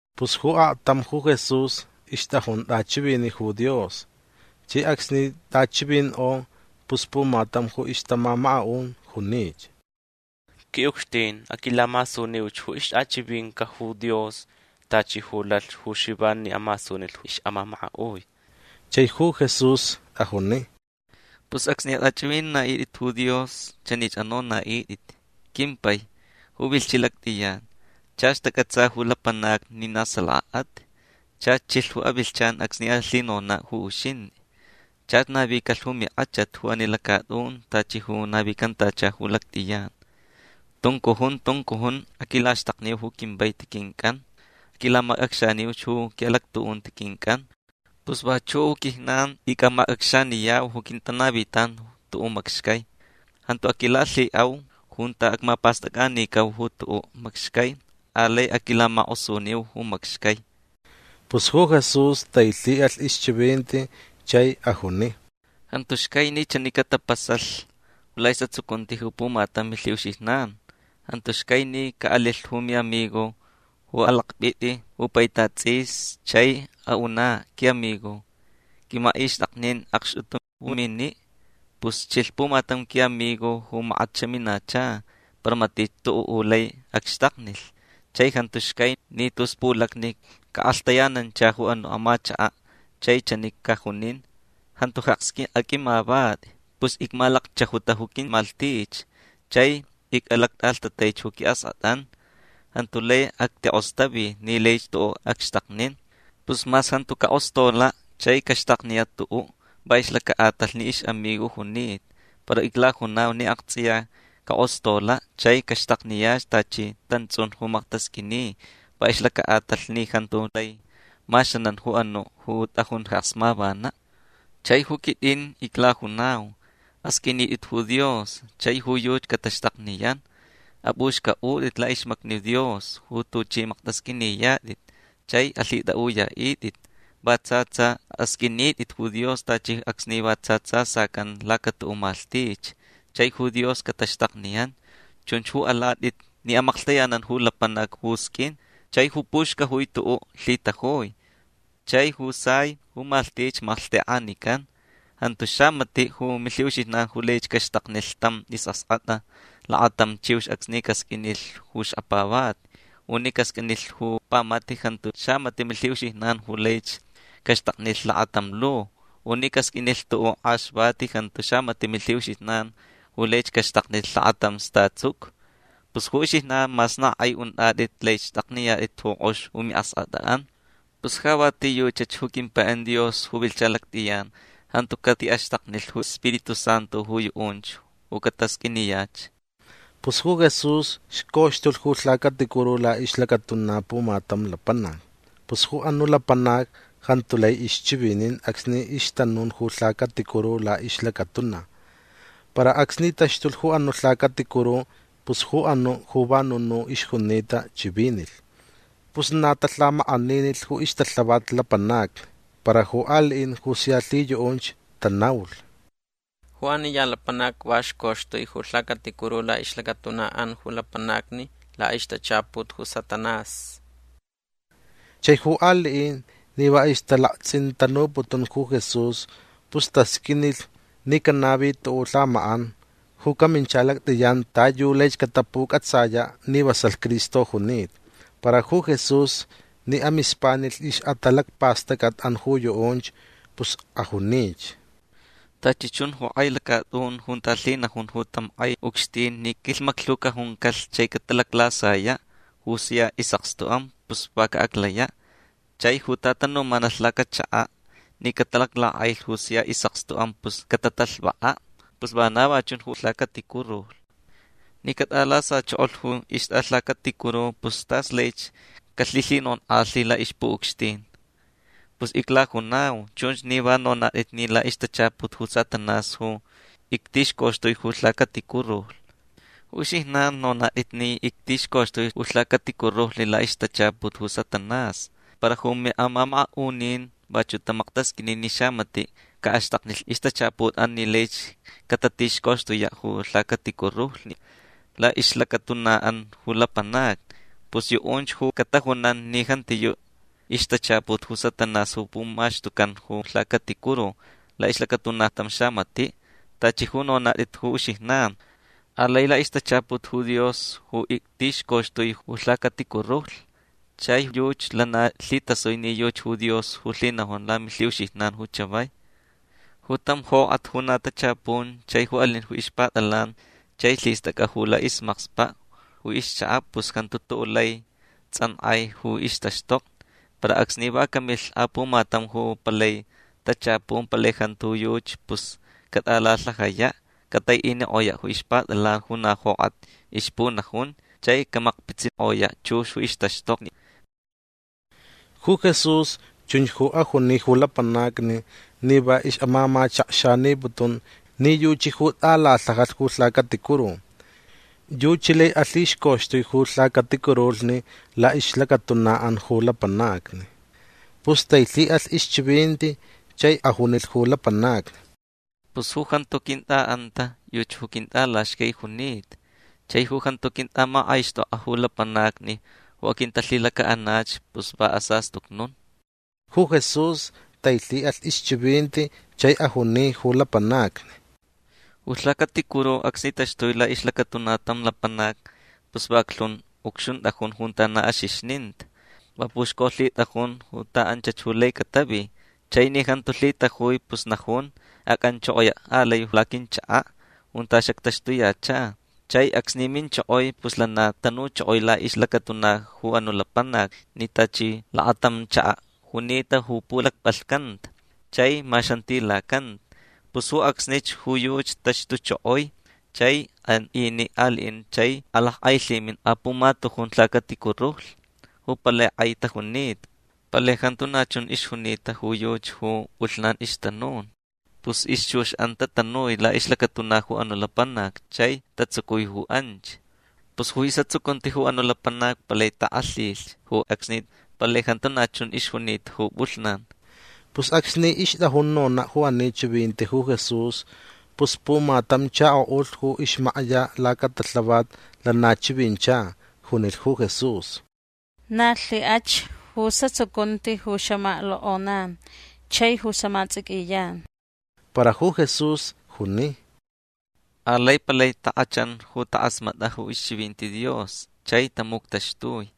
Pus ju aktam ju Jesús ixtʼajun tʼachiviniʼ ju Dios. Chai acsni tʼachivinkʼo pus pumatam ju ixtamamakaʼun junich: ―Quiʼucxtin aquilamasuniuch ju ixtʼachivininca ju Dios tachi ju lalh ju Xivan ni amasunilh ju ixʼamamakaʼui: Chai ju Jesús ajuni: ―Pus acsni atʼachʼivinaʼitʼit ju Dios chanich anonaʼitʼit: Quimpai ju vilhchiʼ lactʼiyan Chach tacʼatsa ju lapanacni ni na salakaʼat. Chach chilh ju avilhchan acsni alhinonaʼ ju uxintʼi. Chach navicalh ju minkʼachat ju ani lacatʼun tachi ju navicantacha ju lactʼiyan. Tuncujun tuncujun aquilaxtakniu ju quivaiti quincʼan. Aquilamacʼacxaniuch ju quiʼalactuʼunti quincʼan. Pus vachuʼ ju quijnan icʼamacʼacxaniyau ju quintanavitan tuʼuʼ macxcai. Jantu aquilalhiʼau junta acmapastʼacʼanicau ju tuʼuʼ macxcai. Alai aquilamakʼosuniu ju macxcai. Pus ju Jesús tailhiʼalh ixchivinti chai ajuni: ―Jantu xcai ni chani ju catapasalh laʼisʼatsucunti ju pumatam ju milhiʼuxijnan. Jantu xcai ni caʼalilh ju miʼamigo ju alakpʼitʼi ju paitat tsʼis chai aʼunaʼ: “Quiʼamigo qʼuimachʼixtʼaknin akxtʼutu ju miniʼ. Pus chilh pumatam quiʼamigo ju makat xaminacha para matich tuʼuʼ ju lai acxtaknilh”. Chai jantu xcai ni tus pulacni caʼakʼalhtayanancha ju anuʼ amachakaʼ chai chani cajunin: “Jantu jeks aqʼuimavatʼi. Pus icmalacchajuta ju quimalhtich chai icʼalactʼalhtataich ju quiʼaskʼatʼan. Jantu lai actikʼostavi ni laich tuʼuʼ acxtaknin”. Pus mas jantu cakʼostolaʼ chai caxtakniyaʼ tuʼuʼ va ixlacaʼatalh ni ixʼamigo junita para iclajunau ni aktsʼiya cakʼostolaʼ chai caxtakniyach tachi tantsʼun ju maktasqʼuini va ixlacaʼatalh ni jantu lai maxanan ju anuʼ ju tʼajun jeks mavanaʼ. Chai ju quitʼin iclajunau: Asqʼuinitʼit ju Dios chai ju yuchi cataxtakniyan. Apʼuxcʼaʼutʼit laʼixmacni Dios ju tuchʼi maktʼasqʼuiniyatʼit chai alhitʼaʼuyaʼitʼit. Va tsa tsa asqʼuinitʼit ju Dios tachi acsni va tsa tsa sacan lacatuʼuʼ malhtich. Chai ju Dios cataxtakniyan. Chunch ju alatʼit ni amaklhtayanan ju lapanac ju sqʼuin. Chai ju puxcajui tuʼuʼ lhitajui. Chai ju sai ju malhtich malhtekʼanican. Jantu xamatiʼ ju milhiʼuxijnan ju laich caxtaknilh tam isʼaskʼatʼa lakatam chiux acsni casqʼuinilh ju xkapavati. U ni casqʼuinilh ju pamata jantu xamatiʼ milhiʼuxijnan ju laich caxtaknilh lakatam lu. U ni casqʼuinilh tuʼuʼ akʼaxvati jantu xamatiʼ milhiʼuxijnan ju laich caxtaknilh lakatam statsucu. Pus ju uxijnan mas na kʼai untʼatʼit lai xtʼakniyatʼit ju kʼox ju miʼaskʼatʼanʼan. Pus ja va a ti yuchach ju quimpaiʼan Dios ju vilhcha lactʼiyan jantu catiʼaxtaknilh ju Spiritu Santu ju yuʼunch ju catasqʼuiniyach. Pus ju Jesús xcoxtulh ju lhacaticuru laʼixlacatuna pumatam lapanac. Pus ju anuʼ lapanac jantu lai ixchivinin acsni ixtanun ju lhacaticuru laʼixlacatuna. Para acsni taxtulh ju anuʼ lhacaticuru pus ju anuʼ ju va nunuʼ ixjunita chivinilh. Pus na talhamakʼaninilh ju ixtalhavat lapanacni. Para ju aliʼin ju sia lhiyuʼunch tanaulh: ―Ju ani ya lapanac va xcoxtui ju lhacaticuru laʼixlacatunaʼan ju lapanacni laʼixtachaput ju Satanás. Chai ju aliʼin ni va ixtalaktsʼintanuputun ju Jesús pus tasqʼuinilh ni canavi tuʼuʼ lhamakʼan ju camincha lactʼiyan ta yu laich catapucʼatsayaʼ ni vasalh Cristo junita. Para ju Jesús ni amispanilh ixʼatalacpastʼacʼatʼan ju yuʼunch pus ajunich: ―Tachi chun ju kʼai lacatʼun junta lhinajun ju tam kʼai ucxtin ni quilhmaclhu cajuncalh chai catalaclasayaʼ ju sia isʼakstuʼan pus va caʼaclayaʼ. Chai ju tatanumanalh lacachakaʼ ni catalaclakʼailh ju sia isʼakstuʼan pus catatalhvakaʼ. Pus vana va chun ju lhacaticuru. Ni catʼalasachokolh ju ixtʼalhacaticuru pus tas laich calhilhinonkʼalhi laʼixpuʼucxtin. Pus iclajunau chunch ni va nonatʼit ni laʼixtachaput ju Satanás ju ictixcoxtui ju lhacaticurulhni. Ju uxijnan nonatʼit ni ictixcoxtui ju lhacaticurulhni laʼixtachaput ju Satanás. Para ju miʼamamakaʼunin vachuʼ tamaktasqʼuini ni xamatiʼ caʼaxtaknilh ixtachaputʼan ni laich catatixcoxtuyaʼ ju lhacaticurulhni laʼixlacatunaʼan ju lapanacni. Pus yuʼunch ju catajunan ni jantiyuʼ ixtachaput ju Satanás ju pumaxtucan ju lhacaticuru laʼixlacatuna tam xamatiʼ tachi ju nonatʼit ju uxijnan. Alai laʼixtachaput ju Dios ju ictixcoxtui ju lhacaticurulhni chai yuchi lana lhitasui ni yuchi ju Dios ju lhinajun lamilhiʼuxijnan ju chavai. Ju tam jokʼat ju na tachapun chai ju alin ju ixpatʼalan chai lhistʼacʼa ju laʼismakspaʼ ju ixchakaʼ pus jantu tuʼuʼ lai tsʼankʼai ju ixtaxtokni. Para acsni va camilh apumatam ju palai tachapun palai jantu ju yuchi pus catʼalalhajayaʼ. Cataiʼinikʼoyaʼ ju ixpatʼalan ju na jokʼat ixpunajun chai camakpitsikʼoyaʼ chux ju ixtaxtokni. Ju Jesús chunch ju ajuni ju lapanacni ni va ixʼamamachakxaniputun ni yuchi ju tʼalalhajalh ju lhacaticuru. Yuchi lai alhixcoxtui ju lhacaticurulhni laʼixlacatunaʼan ju lapanacni. Pus tailhiʼalh ixchivinti chai ajunilh ju lapanacni: ―Pus ju jantu quintʼaʼanta yuchi ju quintʼalaxcai junita. Chai ju jantu quintʼamakʼaixtʼokʼa ju lapanacni ju aquintalhilacaʼanach pus va asastucnun. Ju Jesús tailhiʼalh ixchivinti chai ajuni ju lapanacni: ―Ju lhacaticuru acsni taxtui laʼixlacatuna tam lapanac pus vaclhun ucxuntʼajun junta na axixnita. Va puxcolhitʼajun ta anchach ju lai catavi. Chai ni jantu lhitajui pus najun: “Acʼanchokoyaʼ alai laquinchakaʼ junta xactaxtuyacha”. Chai acsni minchokoi pus lana tanuchokoi laʼixlacatuna ju anuʼ lapanac ni tachi lakatam chakaʼ junita ju pulacpʼalhcanta chai maxantilacanta. Pus ju acsnich ju yuchi taxtuchokoi chai an iniʼ aliʼin chai akʼailhimin apumatujun lhacaticurulhni ju palai kʼai tajunita. Palai jantu na chun ixjunita ju yuchi ju pʼulhnan ixtanun. Pus ixchuxʼan tatanui laʼixlacatuna ju anuʼ lapanac chai tatsucui ju anch. Pus ju isʼatsucunti ju anuʼ lapanac palai takʼalhilh ju acsni. Palai jantu na chun ixjunita ju pʼulhnan. Pus acsni ixtʼajun nonaʼ ju ani chivinti ju Jesús pus pumatam chakoʼulh ju ixmakya lacatalhavat lana chivincha. Junilh ju Jesús: ―Na lhikʼach ju isʼatsucunti ju xamaklokʼoyan chai ju xamatsʼiquiyan. Para ju Jesús juni: ―Alai palai takʼachan ju takʼasmatʼa ju ixchivinti Dios chai tamuctaxtui.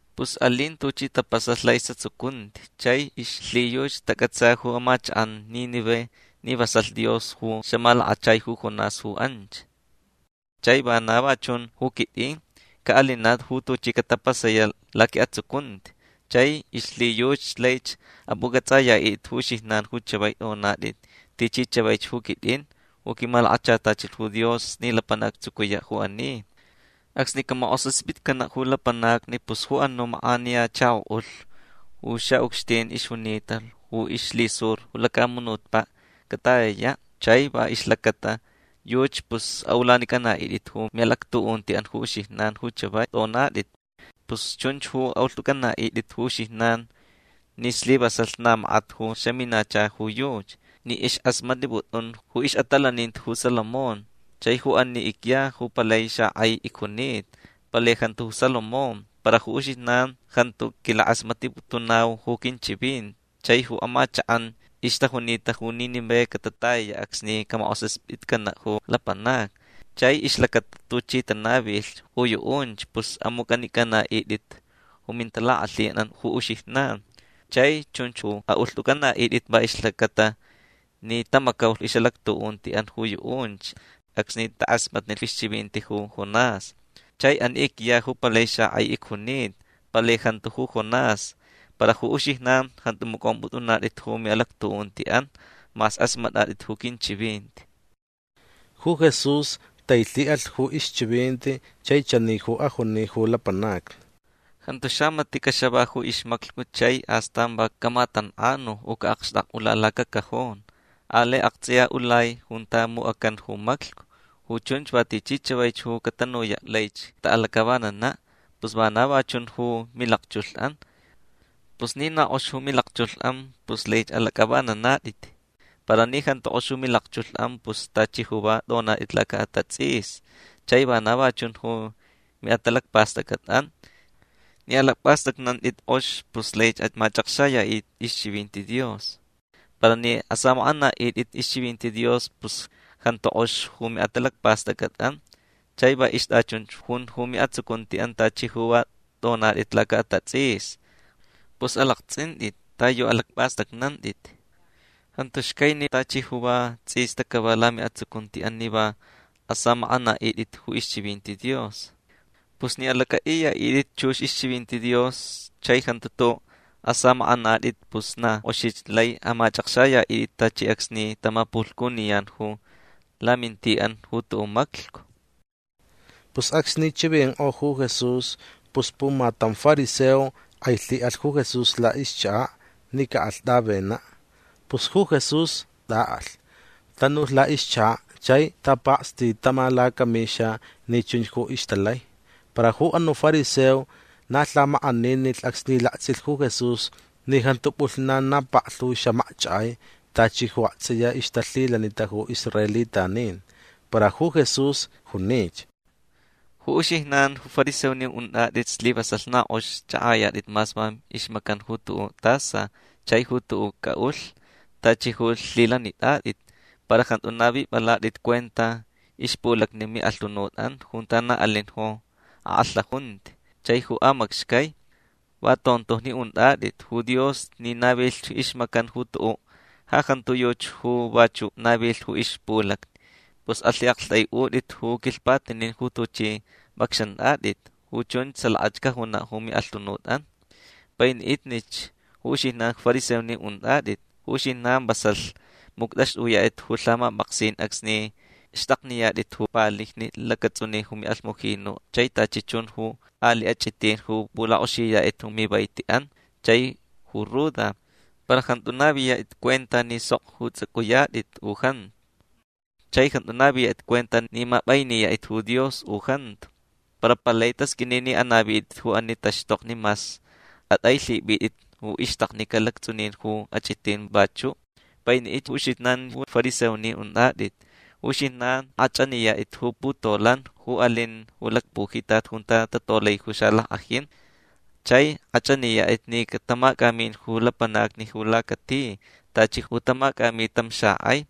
Pus alin tuchi tapasalh laʼisʼatsucunti chai ixlhiyuchi tacʼatsa ju amachakʼan Nínive ni vasalh Dios ju xamalakachai ju Jonás ju anch. Chai vana va chun ju quitʼin. Caʼalinaʼ ju tuchi catapasayaʼ laquiʼatsucunti chai ixlhiyuchi laich apʼucʼatsʼayaʼitʼit ju uxijnan ju chavai tʼonatʼit tichi chavaich ju quitʼin ju quimalakachatachilh ju Dios ni lapanac actsucuyaʼ ju ani. Acsni camakʼosaspitcanaʼ ju lapanacni pus ju anuʼ makʼaniya chakoʼulh ju xaʼucxtin ixjunita ju ixlhisur ju lacamunutpaʼ catayayaʼ chai va ixlacata yuchi pus aʼulanicʼanaʼitʼit ju miʼalactuʼuntiʼan ju uxijnan ju chavai tʼonatʼit. Pus chunch ju aʼulhtʼunicʼanaʼitʼit ju uxijnan ni slivasalh na makat ju xaminacha ju yuchi ni ixkʼasmatniputun ju ixʼatalaninti ju Salomón. Chai ju ani icya ju palai xakʼai icjunita. Palai jantu ju Salomón. Para ju uxijnan jantu quilakʼasmatniputunau ju quinchivinti. Chai ju amachakʼan ixtajunita ju Nínive catatayayaʼ acsni camakʼosaspitcanaʼ ju lapanacni. Chai ixlacata tuchi tanavilh ju yuʼunch pus amucʼanicʼanaʼitʼit ju mintalakʼalhinʼan ju uxijnan. Chai chunch ju aʼulhtʼunicʼanaʼitʼit va ixlacata ni tamacaulh ixʼalactuʼuntiʼan ju yuʼunch acsni takʼasmatnilh ixchivinti ju Jonás. Chai ani icya ju palai xakʼai icjunita. Palai jantu ju Jonás. Para ju uxijnan jantu macʼompʼutʼunatʼit ju miʼalactuʼuntiʼan mas kʼasmatʼatʼit ju quinchivinti. Ju Jesús tailhiʼalh ju ixchivinti chai chani ju ajuni ju lapanacni: ―Jantu xamatiʼ caxava ju ixmaclhcu chai astan va camatankʼanu u caʼakxtakʼula lacacajon. Alai aktsʼiya ulai junta mucʼacan ju maclhcu. Ju chunch va tichi chavaich ju catanuyach laich cataʼalacʼavananaʼ. Pus vana va chun ju milakchulhʼan. Pus ni na kʼox ju milakchulhʼan pus laich alacʼavananatʼit. Para ni jantu kʼox ju milakchulhʼan pus tachi ju va tʼonatʼit lacaʼatatsʼisni. Chai vana va chun ju miʼatalacpastʼacʼatʼan. Ni alacpʼastʼacnantʼit kʼox pus laich amachʼakxayaʼitʼit ixchivinti Dios. Para ni asamakʼanaʼitʼit ixchivinti Dios pus jantu kʼox ju miʼatalacpastʼacʼatʼan. Chai va ixtʼachunch jun ju miʼatsucuntiʼan tachi ju va tʼonatʼit lacaʼatatsʼisni. Pus alaktsʼintʼit ta yu alacpʼastʼacnantʼit. Jantu xcai ni tachi ju va tsʼista cava lamiʼatsucuntiʼan ni va asamakʼanaʼitʼit ju ixchivinti Dios. Pus ni alacʼaʼiyaʼitʼit chux ixchivinti Dios chai jantu tuʼuʼ asamakʼanatʼit pus na kʼoxich lai amachʼakxayaʼitʼit tachi acsni tamapulhcuniyan ju lamintiʼan ju tuʼuʼ maclhcu. Pus acsni chivinkʼo ju Jesús pus pumatam fariseo kʼailhiʼalh ju Jesús laʼixchakaʼ ni caʼalh tʼavenaʼ. Pus ju Jesús tʼaʼalh. Tanulh laʼixchakaʼ chai tapakstitama lacamixa ni chunch ju ixtalai. Para ju anuʼ fariseo na lhamakʼaninilh acsni laktsʼilh ju Jesús ni jantu pʼulhnan na paklhu xamakchakʼai tachi ju aktsʼiya ixtalhilanita ju israelitanin. Para ju Jesús junich: ―Ju uxijnan ju fariseonin untʼatʼit slivasalh na kʼox chʼakʼayatʼit mas va ixmacan ju tuʼuʼ tasa chai ju tuʼuʼ cʼaʼulh tachi ju lhilanitʼatʼit. Para jantu navipʼalatʼit cuenta ixpulacni miʼalhunutʼan junta na alin ju akʼalhaʼunti chai ju amacxcai. Va tontojni untʼatʼit. Ju Dios ni navilh ixmacan ju tuʼuʼ ja jantu yuchi ju vachuʼ navilh ju ixpulacni. Pus alhiʼaktʼaiʼutʼit ju quilhpatinin ju tuchʼi pʼacxantʼatʼit. Ju chunch salaka cajunaʼ ju miʼalhunutʼan. Painiʼitnich ju uxijnan ju fariseonin untʼatʼit. Ju uxijnan vasalh muctʼaxtʼuyatʼit ju lhamapʼaksin acsni xtʼakniyatʼit ju palijni lactsʼunin ju alhmujinu chai tachi chun ju aliʼ achʼitin ju pulakʼoxiyatʼit ju mivaitiʼan chai ju ruda. Para jantu naviyatʼit cuenta ni sok ju tsʼucʼuyatʼit u jantu. Chai jantu naviyatʼit cuenta ni mapʼainiyatʼit ju Dios u jantu. Para palai tasqʼuini ni anavitʼit ju ani taxtokni mas atʼailhipʼitʼit ju ixtaknica lactsʼunin ju achʼitin vachuʼ. Painiʼitnich ju uxijnan ju fariseonin untʼatʼit. Ju uxijnan kʼachʼaniyatʼit ju putolan ju alin ju lacpujitat junta tatolai ju xalackʼajin. Chai kʼachʼaniyatʼit ni catamacʼamin ju lapanacni ju lacati tachi ju tamacʼami tam xakʼai.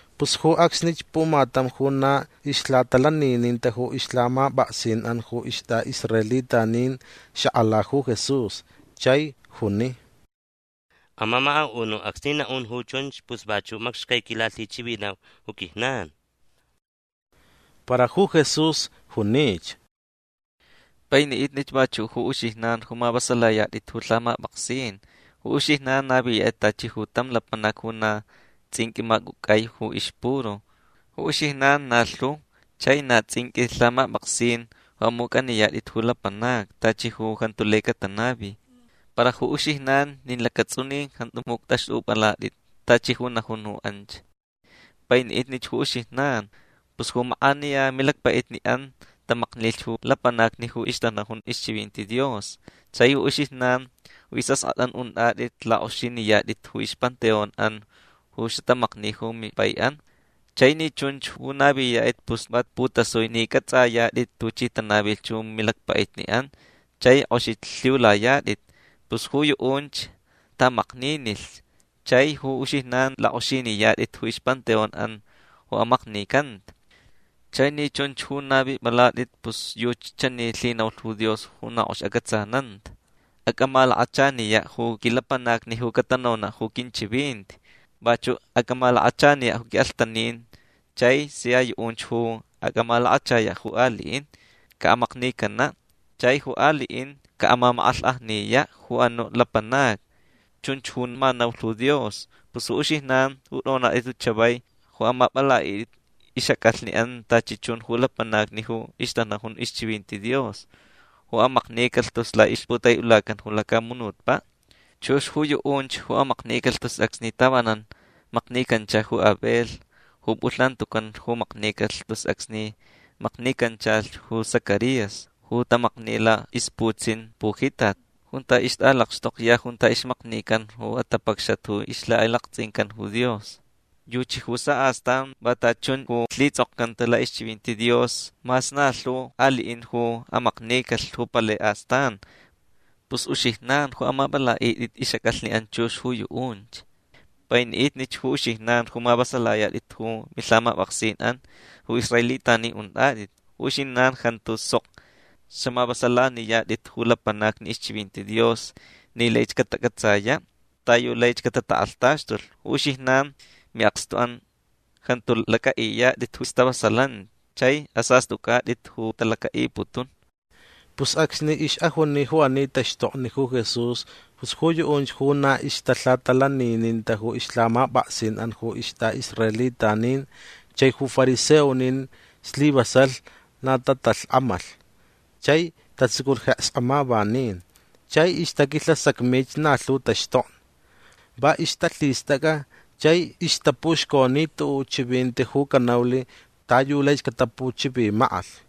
Pus ju acsnich pumatam ju na ixlhatalanininta ju ixlhamapʼaksinʼan ju istʼaʼisraelitanin xakʼala ju Jesús chai juni: ―Amamakaʼunuʼ acsni naʼun ju chunch pus vachuʼ macxcai quilalhichivinau ju quijnan. Para ju Jesús junich: ―Painiʼitnich vachuʼ ju uxijnan ju mavasalayatʼit ju lhamapʼaksin. Ju uxijnan naviyatʼit tachi ju tam lapanac ju na tsʼinqʼui macʼucʼai ju ixpuru. Ju uxijnan na lhu chai na tsʼinqʼui lhamapʼaksin ju amucʼaniyatʼit ju lapanacni tachi ju jantu lai catanavi. Para ju uxijnan nin lacatsʼunin jantu muctʼaxtʼupʼalatʼit tachi ju najun ju anch. Painiʼitnich ju uxijnan. Pus ju makʼaniya milacpaʼitniʼan tamaknilh ju lapanacni ju ixtanajun ixchivinti Dios. Chai ju uxijnan ju isʼaskʼatʼan untʼatʼit lakʼoxiniyatʼit ju ixpanteonʼan ju xatamakni ju mimpaiʼan. Chai ni chunch ju naviyatʼit pus va putasui ni cʼatsʼayatʼit tuchi tanavilh ju milacpaʼitniʼan chai kʼoxich lhiulayatʼit. Pus ju yuʼunch taʼamakninilh chai ju uxijnan lakʼoxiniyatʼit ju ixpanteonʼan ju amaknicanta. Chai ni chunch ju navipʼalatʼit pus yuchi chani lhinaulh ju Dios ju na kʼox acʼatsananta: “Acʼamalakachaniyaʼ ju quilapanacni ju catanonaʼ ju quinchivinti. Vachuʼ acʼamalakachaniyaʼ ju quiʼalhtanin. Chai sia yuʼunch ju acʼamalakachayaʼ ju aliʼin caʼamaknicanaʼ. Chai ju aliʼin caʼamamakʼalhkʼajniyaʼ ju anuʼ lapanacni”. Chunch ju ma naulh ju Dios. Pus uxijnan ju tʼonatʼit ju chavai ju amapʼalaʼitʼit ixʼacʼalhniʼan tachi chun ju lapanacni ju ixtanajun ixchivinti Dios ju amaknicalh tus laʼixputaiʼulacan ju lacamunutpaʼ. Chux ju yuʼunch ju amaknicalh tus acsni tavanan maknicancha ju Abel ju pʼulhnan tucan ju maknicalh tus acsni maknicanchalh ju Zacarías ju tamakni laʼixputsin pujitat junta ixtʼalakxtokya junta ixmaknican ju atapacxat ju ixlhakʼailaktsʼincan ju Dios. Yuchi ju saʼastan va tachi chun ju lhitsʼokcanta laʼixchivinti Dios mas na lhu aliʼin ju amaknicalh ju palai astan. Pus uxijnan ju amapʼalaʼitʼit ixʼacʼalhniʼan chux ju yuʼunch. Painiʼitnich ju uxijnan ju mavasalayatʼit ju milhamapʼaksinʼan ju israelitanin untʼatʼit. Ju uxijnan jantu sok xaʼamavasalaniyatʼit ju lapanacni ixchivinti Dios ni laich catacʼatsayaʼ ta yu laich catatakʼalhtaxtulh. Ju uxijnan miʼakstuʼan jantu lacʼaʼiyatʼit ju stavasalanti chai asastʼucʼatʼit ju talacaʼiputun. Pus acsni ixʼajuni ju ani taxtokni ju Jesús pus ju yuʼunch ju na ixtalhatalanininta ju ixlhamapʼaksinʼan ju istʼaʼisraelitanin chai ju fariseonin slivasalh na tatalhkʼamalh chai tatsuculh jeks amavanin. Chai ixtaquilhasacmich na lhu taxtokni. Va ixtalhistʼacʼa chai ixtapuxconi tuʼuʼ chivinti ju canaulh ta yu laich catapuchivimakʼalh.